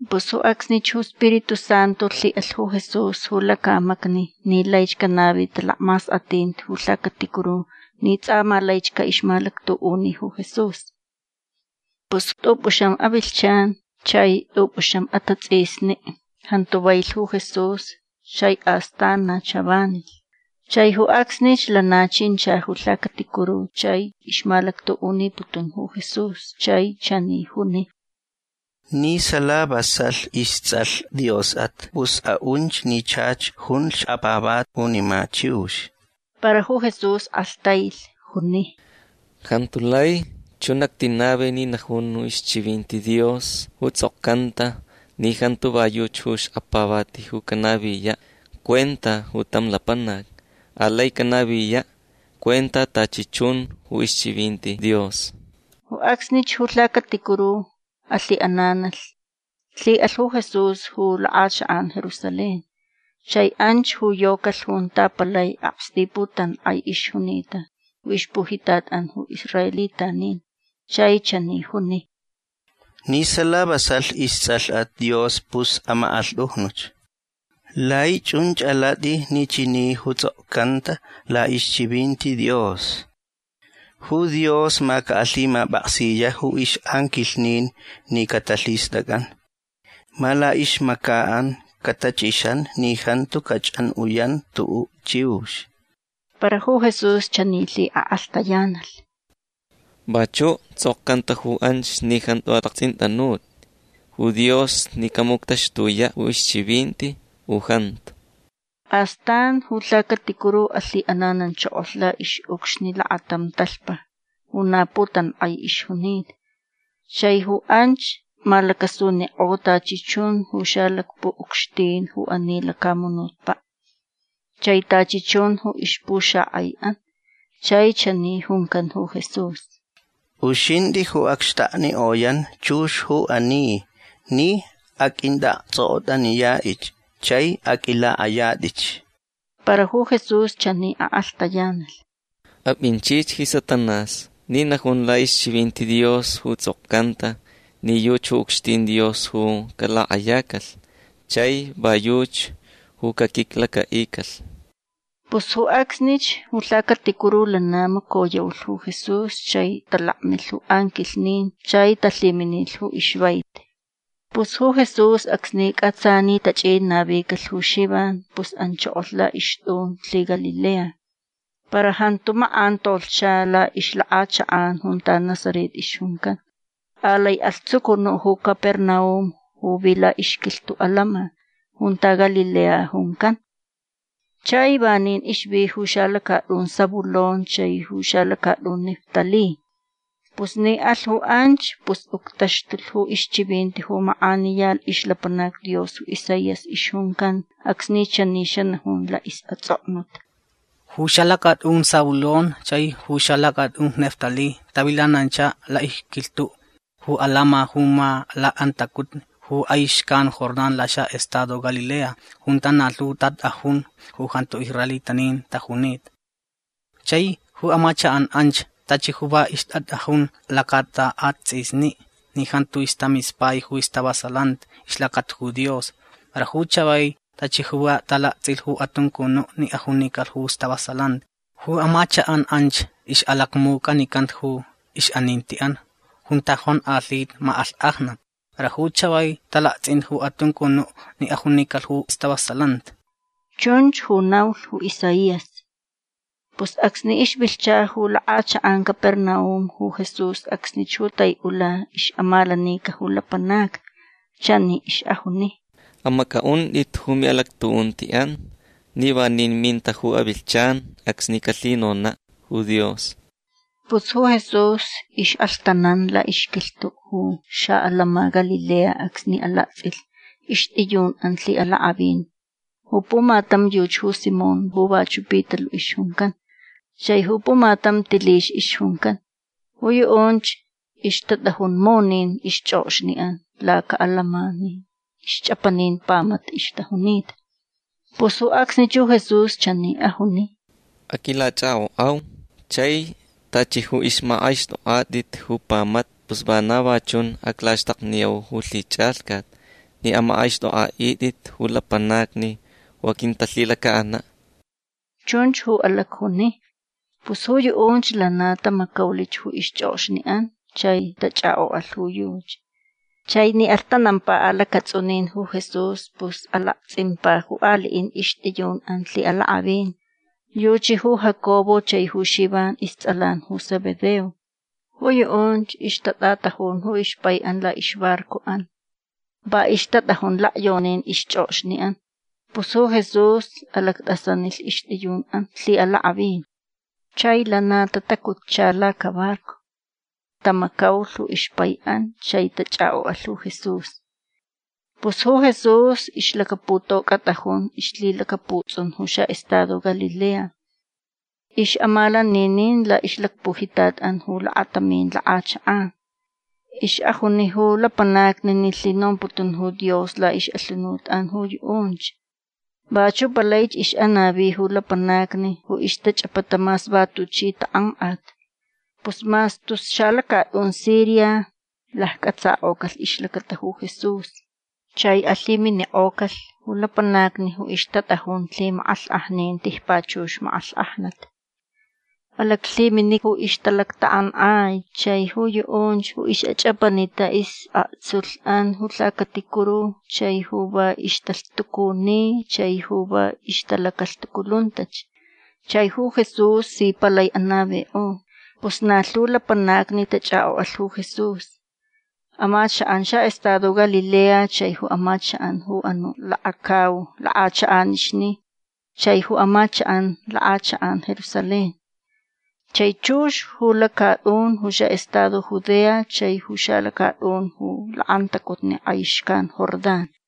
Pus ju acsnich ju Spiritu Santu lhiʼalh ju Jesús ju lacamacni ni laich canavi talacmaskʼatinti ju lhacaticuru ni tsʼa ma laich caʼixmalactuʼuni ju Jesús. Pus tʼupʼuxam avilhchan chai tʼupʼuxam atatsʼisni jantu vailh ju Jesús chai astan na chavanilh. Chai ju acsnich lana chincha ju lhacaticuru chai ixmalactuʼuniputun ju Jesús. Chai chani juni: ―Ni sala vasalh istsʼalh Diosʼat pus aʼunch ni chach junlh xkapavati junima chiux. Para ju Jesús kʼalhtailh. Juni: ―Jantu lai chun actinavi ni najun ju ixchivinti Dios ju tsʼokcanta ni jantu va yuchi ju xkapavati ju canaviyaʼ cuenta ju tam lapanac. Alai canaviyaʼ cuenta tachi chun ju ixchivinti Dios. Ju acsnich ju lhacaticuru alhiʼananalh. Lhiʼalh ju Jesús ju lakʼachakʼan Jerusalén. Chai anch ju yocalh junta palai aksti putankʼai ixjunita ju ixpujitatʼan ju israelitanin. Chai chani juni: ―Ni sala vasalh istsʼalhʼat Dios pus amakʼanlhtʼujnuch. Lai chunch alatʼi ni chani ju tsʼokcanta laʼixchivinti Dios: Ju Dios ma caʼalhimapʼaksiyaʼ ju ixʼanquilhnin ni catalhistʼacʼan. Ma laʼixmacaʼan catachʼixan ni jantu cachʼanʼuyan tuʼuʼ chiux. Para ju Jesús chani lhiʼakʼalhtayanalh: ―Vachuʼ tsʼokcanta ju anch ni jantu alaktsʼintʼanutʼi ju Dios ni camuctaxtuyaʼ ju ixchivinti u jantu. Astan ju lhacaticuru alhiʼanananchokolh laʼixʼucxni lakatam talhpa ju na putankʼai ixjunita. Chai ju anch malacasunikʼo tachi chun ju xalacpuʼucxtin ju ani lacamunutpaʼ chai tachi chun ju ixpuxakʼaiʼan. Chai chani juncan ju Jesús: ―Uxintʼi ju acxtaknikʼoyan chux ju ani ni aqʼuintʼaʼaktsʼokʼotʼaniyaʼich chai aqʼuilakʼayatʼich. Para ju Jesús chani akʼalhtayanalh: ―Apʼinchich ji Satanás ni najun laʼixchivinti Dios ju tsʼokcanta ni yuchi ju ucxtin Dios ju calakʼayacalh chai va yuchi ju caquiclacaʼicalh. Pus ju acsnich ju lhacaticuru lana macoyaulh ju Jesús chai talakmilh ju anquilhnin chai talhiminilh ju ixvaiti. Pus ju Jesús acsni cʼatsa ni tachʼin navicalh ju Xivan pus anchokolh laʼixtʼun lhiGalilea. Para jantu makʼan tolhcha laʼixlakʼachakʼan junta Nazaret ixjuncan. Alai alh tsucunuʼ ju Capernaum ju vi laʼixquilhtuʼ atantsʼin junta Galilea juncan. Chai vanin ixvi ju xalacatʼun Zabulón chai ju xalacatʼun Neftalí. Pus ni alh ju anch pus uctaxtulh ju ixchivinti ju makʼaniya ixlapanac Dios ju Isaías ixjuncan acsni chani xanajun laʼisʼatsʼoknut. Ju xalacatʼun Zabulón chai ju xalacatʼun Neftalí tavilanancha laʼixquilhtuʼ ju atantsʼin ju ma lakʼantacutni ju kʼai xcan Jordán laxaʼestado Galilea junta na lhu tatʼajun ju jantu israelitanin tajunita. Chai ju amachakʼan anch tachi ju va ixtatʼajun lacaʼatatsʼisni ni jantu ixtamispai ju ixtavasalanti ixlacata ju Dios. Para ju chavai tachi ju va talaktsʼilh ju atuncunuʼ ni ajunicalh ju stavasalanti. Ju amachakʼan anch ixʼalacmucʼanicanta ju ixʼanintiʼan junta jonkʼalhita makʼalhkʼajnat. Para ju chavai talaktsʼinta ju atuncunuʼ ni ajunicalh ju stavasalanti. Chunch ju naulh ju Isaías. Pus acsni ixvilhcha ju lakʼachakʼan Capernaum ju Jesús acsnich ju taiʼula ixʼamalanica ju lapanacni. Chani ixʼajuni: ―Amacʼaʼuntʼit ju miʼalactuʼuntiʼan ni vanin minta ju avilhchan acsni calhinonaʼ ju Dios. Pus ju Jesús ixʼalhtanan laʼixquilhtuʼ ju xaʼatantsʼin Galilea acsni alaktsʼilh ixtʼiyunʼan lhiʼalakʼavin. Ju pumatam yuchi ju Simón ju vachuʼ Pitaluʼ ixjuncan. Chai ju pumatam Tilix ixjuncan. Ju yuʼunch ixtatʼajun munin ixchʼokxniʼan lacaʼatantsʼin ni ixchʼapanin pamata ixtajunita. Pus ju acsnich ju Jesús chani ajuni: ―Aquilachʼakʼokʼau chai tachi ju ixmakʼaixtʼokʼatʼit ju pamata pus vana va chun aclaxtakniyau ju lhichʼalhcat ni amakʼaixtʼokʼaʼitʼit ju lapanacni ju aquintalhilacaʼanaʼ. ―Chunch ju alacjuni. Pus ju yuʼunch lana tamacaulich ju ixchʼokxniʼan chai tachʼakʼokʼalh ju yuchi. Chai ni alhtanampa alacatsʼunin ju Jesús pus alaktsʼimpa ju aliʼin ixtʼiyunʼan lhiʼalakʼavin. Yuchi ju Jacobo chai ju Xivan istsʼalan ju Zebedeo. Ju yuʼunch ixtatʼatajun ju ixpaiʼan laʼixbarcoʼan. Va ixtatʼajun lakyonin ixchʼokxniʼan. Pus ju Jesús alactʼasanilh ixtʼiyunʼan lhiʼalakʼavin. Chai lana tatacutcha lacabarco. Tamacaulh ju ixpaiʼan. Chai tachʼakʼokʼalh ju Jesús. Pus ju Jesús ixlacaputocʼatʼajun ixlhilacaputsʼun ju xaʼestado Galilea. Ixʼamalaninin laʼixlacpujitatʼan ju lakatamin lakʼachakʼan. Ixʼajuni ju lapanacni ni lhinomputun ju Dios laʼixʼalhunutʼan ju yuʼunch. Vachuʼ palaich ixʼanavi ju lapanacni ju ixtachʼapata mas va tuchi takʼankʼat. Pus mas tus xalacatʼun Siria laccʼatsakʼocalh ixlacata ju Jesús. Chai alhiminikʼocalh ju lapanacni ju ixtatʼajun lhimakʼalhkʼajnin tijpachux makʼalhkʼajnat. Alaclhimini ju ixtalactakʼankʼai chai ju yuʼunch ju ixʼachʼapanita isʼaktsulhʼan ju lhacaticuru chai ju va ixtalhtucuni chai ju va ixtalacalhtuculuntach. Chai ju Jesús si palai anavikʼo. Pus na lhu lapanacni tachʼakʼokʼalh ju Jesús. Amachakʼan xaʼestado Galilea chai ju amachakʼan ju anuʼ lakacau lakʼachakʼanixni chai ju amachakʼan lakʼachakʼan Jerusalén chai chux ju lacatʼun ju xaʼestado Judea chai ju xalacatʼun ju lakʼantacutni kʼai xcan Jordán.